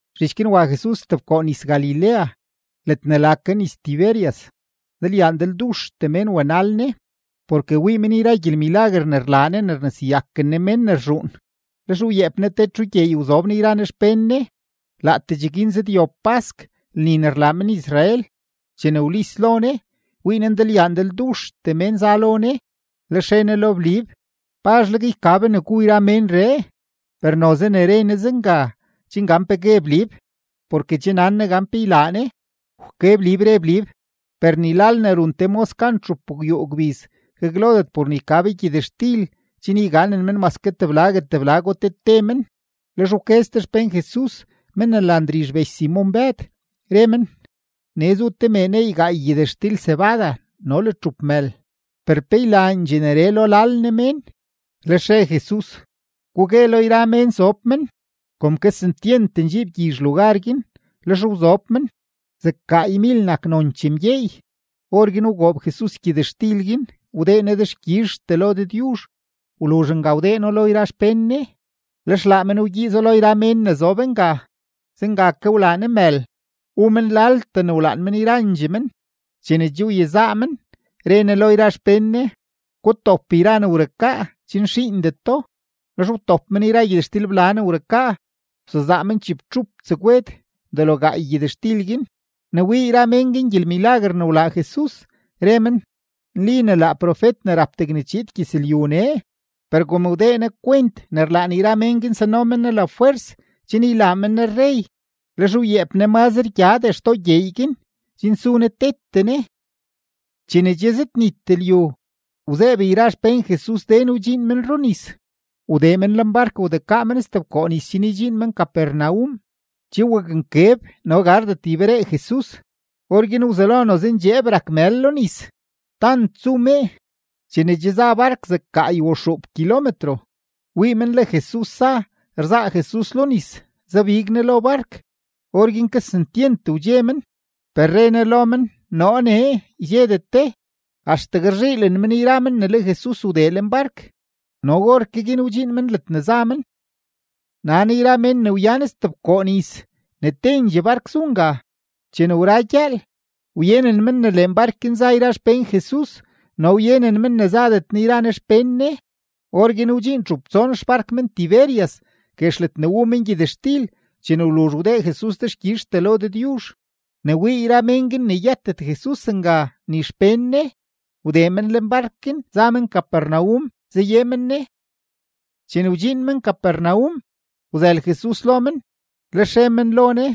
Zhich guin wa Jesus stebkoo nis-Galilea ledne la ke nis-Tiberias. Ndalyaa ndalduxtee mén wa wanal Ne, porke wii men yra gyelmilaguer ne rlaa Ne ne rneseyaken Ne mén ne rzhuun. Lex wyeep Ne te txu gyeey wzob Ne yra Ne xpén Ne. Laatee cheguin zëdyob pask lni ne rlaa men-Israel. Chene wlis lo Ne, wii Ne ndalyaa ndalduxtee mén za lo Ne, lex re Ne lo Blib: ―¿Pazhleg yka be ne gu yra ménree? Per noze ne re Ne zenga chen gan pe gue Blib, porke che nan Ne gan pe ylaa Ne. Wke Blib, re Blib: ―Per ni lal ne run te mos gan txupgwyuu gbiz gaglodet por ne yka be gyëtxtil chen yganen men mase teblago teblago te te men. Lex wke ste xpén Jesus, men ne la Ndrizh bech Simon-Bëd, re men: ―Nee zu te mee ne neey gaay gyëtxtil cebada no le txup mël, per ¿pe ylaandxee neree lo lal ne mén? Lex re Jesus: ―Gugue lo yra mén sob men. Kom kesentyent ndxiib gyizh lugar guin, lex wzob men. Zeg gaaymil nak nonchee mgyeey. Orguin wgoob Jesus gyëtxtil guin, wdee Ne dexkyizhtee lo Dëdyuzh. Wluzh nga wdee No lo yra xpén Ne, lex laa men wgyiizo lo yra mén ne zob nga; zenga ke wlaa Ne mël, wu men laltee ne wlaan men yrandxee men. Chene che wyezaa men, re Ne lo yra xpén Ne: ―Gutop yra ne wrukaa chen xiindeto. Lex wtop men yra gyëtxtilbla ne wrukaa, wsezaa men chibtxup tsegwed delo gaay gyëtxtil guin. Ne wii yra mén guin gyelmilaguer ne wlaa Jesus, re men: ―Nli ne laa profet ne rap degne chiid gyëzlyu nee. Per kom wdee Ne kwent ne rlaan yra mén guin sano men Ne lafwers chen ylaa men Ne rrey, lex wyeep Ne mazre gyadee xtoo gyeey guin chen su Ne tete Ne. Chene che zëdnit lyu, wzeeb yra xpén Jesus den wdxiin men runis, wdee men lenbark wdekaa men stebkoo nis chen ydxiin men Capernaum. Che waknkeb no gardet yberee Jesus. Orguin wzelo noze ndxeeb rak mël lo nis, tant zu mee. Chene che za bark zeg gaay o xuup kilometro, wii men le Jesus za, rzaa Jesus lo nis, zabig Ne lo bark; orguin kesentyent wdxe men. Per re Ne lo men: ―Noo nee, ydxedet de. Axtegue rzhiilen men yra men ne le Jesus wdee lenbark, no orke guin wdxiin men ledne za men. Nan yra mén ne wyan stebkoo nis ne tendxee bark zu nga. Chene wra gyëël, wyenen men ne lenbark guin za yra xpén Jesus no wyenen men ne zadet Ne yra Ne xpén Ne. Orguin wdxiin txup tson xbark men-Tiberias guex ledne wu men gyëtxtil chene wluzh wdee Jesus dexkyizhtee lo Dëdyuzh. Ne wii yra mén guin ne yëtet Jesus nga ni xpén Ne, wdee men lenbark guin za men Capernaum zaye men Ne. Chene wdxiin men Capernaum, wzël Jesus lo men, lex re men lo Ne: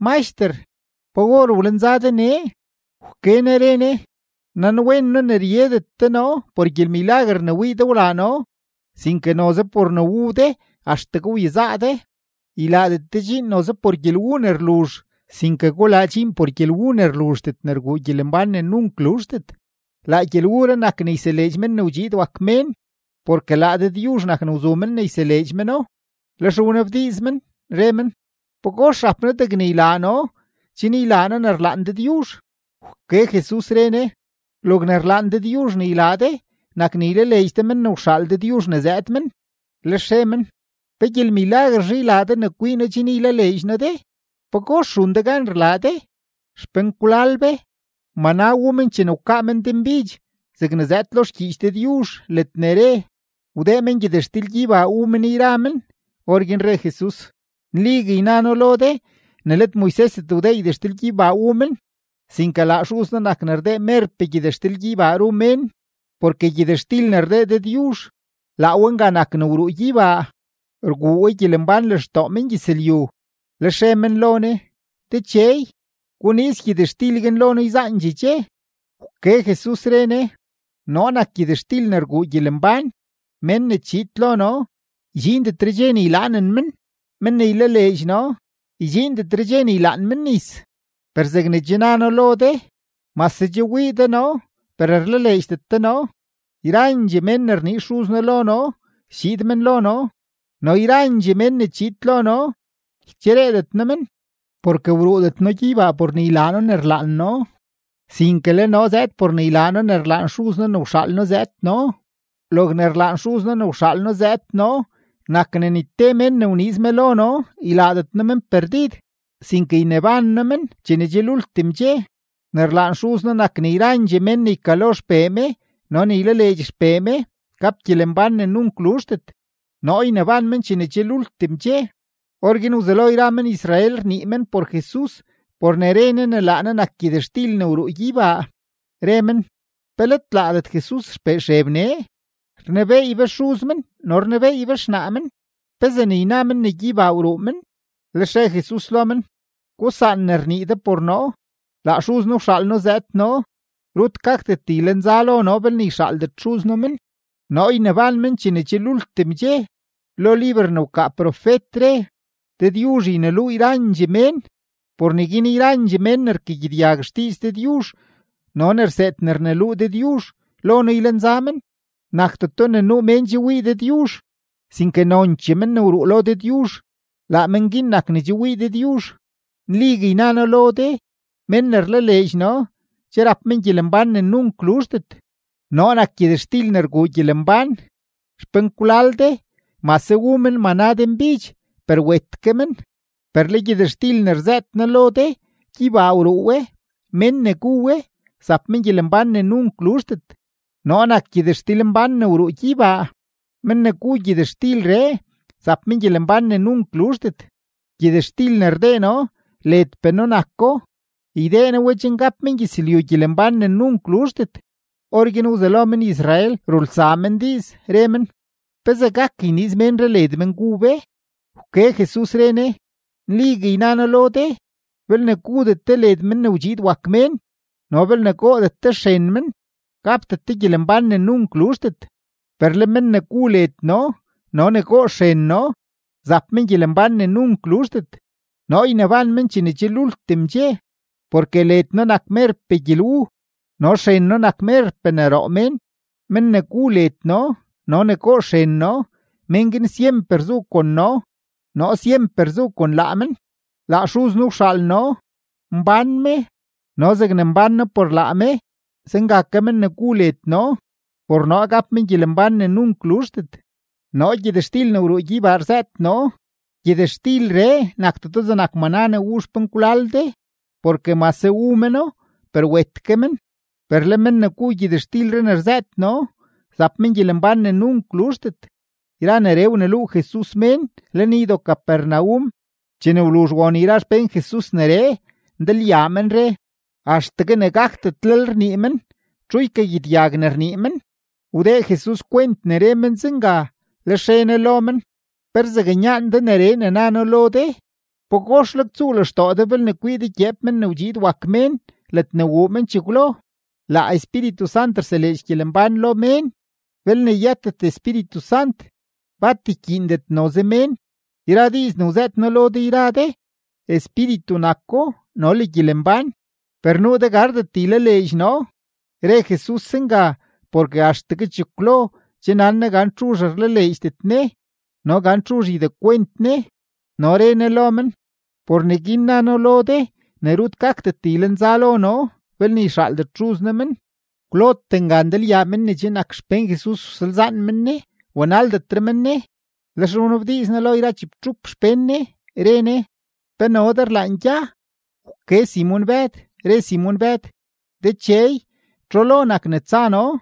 ―Maxter, ¿pa or wlenza de nee? Wke Ne re Ne: ―Nanwen noo ne ryedet de noo por gyelmilaguer ne wii de wlaa noo, sinke noze por ne wu de axtegue wyezaa de. Ylaadet de dxiin noze por gyelwu ne rluzh, sinke gulaa dxiin por gyelwu ne rluzhdet ne rguu gyelembán ne nunk luzhdet, laa gyelwuree nak ne yseleedx Men ne wdxiid wak Mén, porke laa Dëdyuzh nak ne wzu men ne yseleedx meno. Lex wnabdiiz men, re men: ―¿Pagox rap noo degne ylaa noo chen ylaa noo ne rlaan Dëdyuzh? Wke Jesus, re Ne: ―Logne rlaan Dëdyuzh ne ylaa de nak ne ylaleedx de men ne wxaal Dëdyuzh ne zëëd men. Lex re men: ―¿Pe gyelmilaguerzhe ylaa de ne kwii noo chen ylaleedx noo de? ¿Pagox run de gan rlaa de? Xpenkwlal be, maná wu men chene wkaa men denbidx zegne zëëd lo xgyiich Dëdyuzh ledne re: “Wdee men gyëtxtil-gyeybaa wu men yra men.” Orguin re Jesus: ―Nligue yna noo lo de ne let Moisesdet wdee gyëtxtil-gyeybaa wu men, sinke laa Xuz noo nak ne rdee merpee gyëtxtil-gyeybaa ru mén. Porke gyëtxtil ne rdee Dëdyuzh, laa we nga nak ne wruu gyeybaa, rguu we gyelembán lextoo mengyëzlyu. Lex re men lo Ne: ―Dechey, guniiz gyëtxtil guin lo noo yzaandxee dxe. Wke Jesus, re Ne: ―Noo nak gyëtxtil ne rguu gyelembán; mén ne chiid lo noo, ydxiindetre dxe ne ylaanen men; men ne ylaleedx noo, ydxiindetre dxe ne ylaan men nis. Per zegne che na noo lo de, mase che wii de noo, per rlaleedxdet de noo. Yrandxee mén ne rniiz Xuz noo lo noo, schiid men lo noo; no yrandxee mén ne chiid lo noo, ychereedet noo men. Porke wruudet noo gyeybaa por ne ylaa noo ne rlaan noo, sinke le noo zëëd por ne ylaa noo ne rlaan Xuz noo ne wxaal noo zëëd noo. Logne rlaan Xuz noo ne wxaal noo zëëd noo nak ne ni te mén ne wniiz me lo noo ylaadet noo men perdid, sinke yneban noo men chene che lultim dxe. Ne rlaan Xuz noo nak ne yrandxee mén ne ykalo XPee me no ne ylaleedx XPee me, gap gyelembán ne nunk luzhdet; noo yneban men chene che lultim dxe. Orguin wzelo yra men-Israel rnii men por Jesus por ne re Ne ne laa Ne nak gyëtxtil ne wruu gyeybaa. Re men: ―¿Pe let laadet Jesus xpee Xeb nee? Rnebeey be xuz men no rnebeey be xnaa men. ¿Pezee ne yna men ne gyeybaa wruu men? Lex re Jesus lo men: ―Gusaan ne rnii de por noo. Laa Xuz noo wxaal noo zëëd noo. Rut gakdet ylenza lo noo belne yxaaldet Xuz noo men; noo yneban men chene che lultim dxe. Lo liber ne wkaa profet re: “Dëdyuzh yneluu yrandxee mén.” Por neguin yrandxee mén ne rkagyedyag xdiiz Dëdyuzh no ne rseed ne rneluu Dëdyuzh, lo noo ylenza men. ’Nakdeto ne nuu mén che wii Dëdyuzh, sinke nonchee men ne wruu lo Dëdyuzh, laa men guin nak ne che wii Dëdyuzh. Nligue yna noo lo de, mén ne rlaleedx noo che rap men gyelembán ne nunk luzhdet. Noo nak gyëtxtil ne rguu gyelembán. Xpenkwlal de, mase wu men maná denbidx, per wet ke men. Per le gyëtxtil ne rzëët noo lo de gyeybaa wruu we; mén ne gu we, zap men gyelembán ne nunk luzhdet. Noo nak gyëtxtilmbán ne wruu gyeybaa; men ne gu gyëtxtilree, zap men gyelembán ne nunk luzhdet. Gyëtxtil ne rdee noo ledpee noo nako; ydee noo we chen gap mengyëzlyu gyelembán ne nunk luzhdet. Orguin wzelo men-Israel rulsaa men diiz, re men: ―¿Pezee gak yniiz ménree led men gu be? Wke Jesus, re Ne: ―Nligue yna noo lo de, belne gudet de led Men ne wdxiid wak Mén no belne goodet de xren men, gapdet de gyelembán ne nunk luzhdet. Per le men ne gu led noo no ne goo xren noo, zap men gyelembán ne nunk luzhdet; noo yneban men chene che lultim dxe. Porke led noo nak merpee gyelwu, no xren noo nak merpee ne roo mén. Men ne gu led noo no ne goo xren noo, men guin syemper zu kon noo, noo syemper zu kon laa men. Laa Xuz noo wxaal noo, mbán me, no zegne mbán noo por laa me, zenga ke men ne gu led noo, por noo gap men gyelembán ne nunk luzhdet. Noo gyëtxtil ne wruu gyeybaa rzëët noo; gyëtxtilree nakdeto zegnak maná ne wu xpenkwlal de, porke mase wu meno, per wet ke men; per le men ne gu gyëtxtilree ne rzëët noo, zap men gyelembán ne nunk luzhdet. Yra neree wneluu Jesus mén lenydo-Capernaum. Chene wluzh won yra xpén Jesus neree, ndalyaa men re: ―Axtegue ne gakdetlel rnii men; ¿txu ykagyedyag ne rnii men? Wdee Jesus kwent ne re men zenga, lex re Ne lo men: ―¿Pe rzaknyaan de neree ne na noo lo de? ¿Pagoxleg tsuu lextoo de belne kwii de gyeep Men ne wdxiid wak Mén ledne wuu men chekwlo? Laa Espíritu Sant rseleedx gyelembán lo mén; belne yëtet Espíritu Sant, bat ykyiindet noze mén. Yra diiz ne wzëët noo lo de yra de, espíritu nako no le gyelembán. Per nuu de gardet ylaleedx noo. Re Jesus zenga porke axtegue chekwlo che nan Ne gan txuzh rlaleedxdet Ne no gan txuzh ydekwent Ne. No re Ne lo men: ―Por neguin na noo lo de ne rut gakdet ylenza lo noo belne yxaaldet Xuz noo men. Kwlote nga ndalyaa men ne che nak xpén Jesus wsalzaan men Ne, wanaldetre men Ne. Lex wnabdiiz Ne lo yra chibtxup xpén Ne, re Ne: ―¿Pe no de rlaan gya? Wke Simon-Bëd, re Simon-Bëd: ―Dechey, ¿txu lo nak ne tsa noo?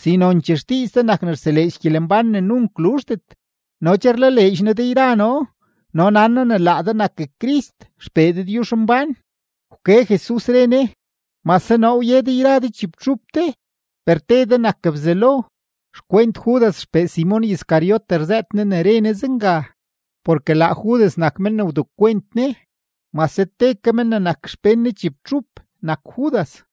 Si nonchee xdiiz de nak ne rseleedx gyelembán ne nunk luzhdet. No che rlaleedx noo de yra noo no nan noo ne laa de nak Crist XPee Dëdyuzhmbán. Wke Jesus, re Ne: ―Mase noo wye de yra de chibtxup de, per te de nak Bzelo. Xkwent Judas xpee Simon Iscariote rzëët Ne ne re Ne zenga. Porke laa Judas nak men ne wdekwent Ne, mase te ke men ne nak xpén Ne chibtxup nak Judas.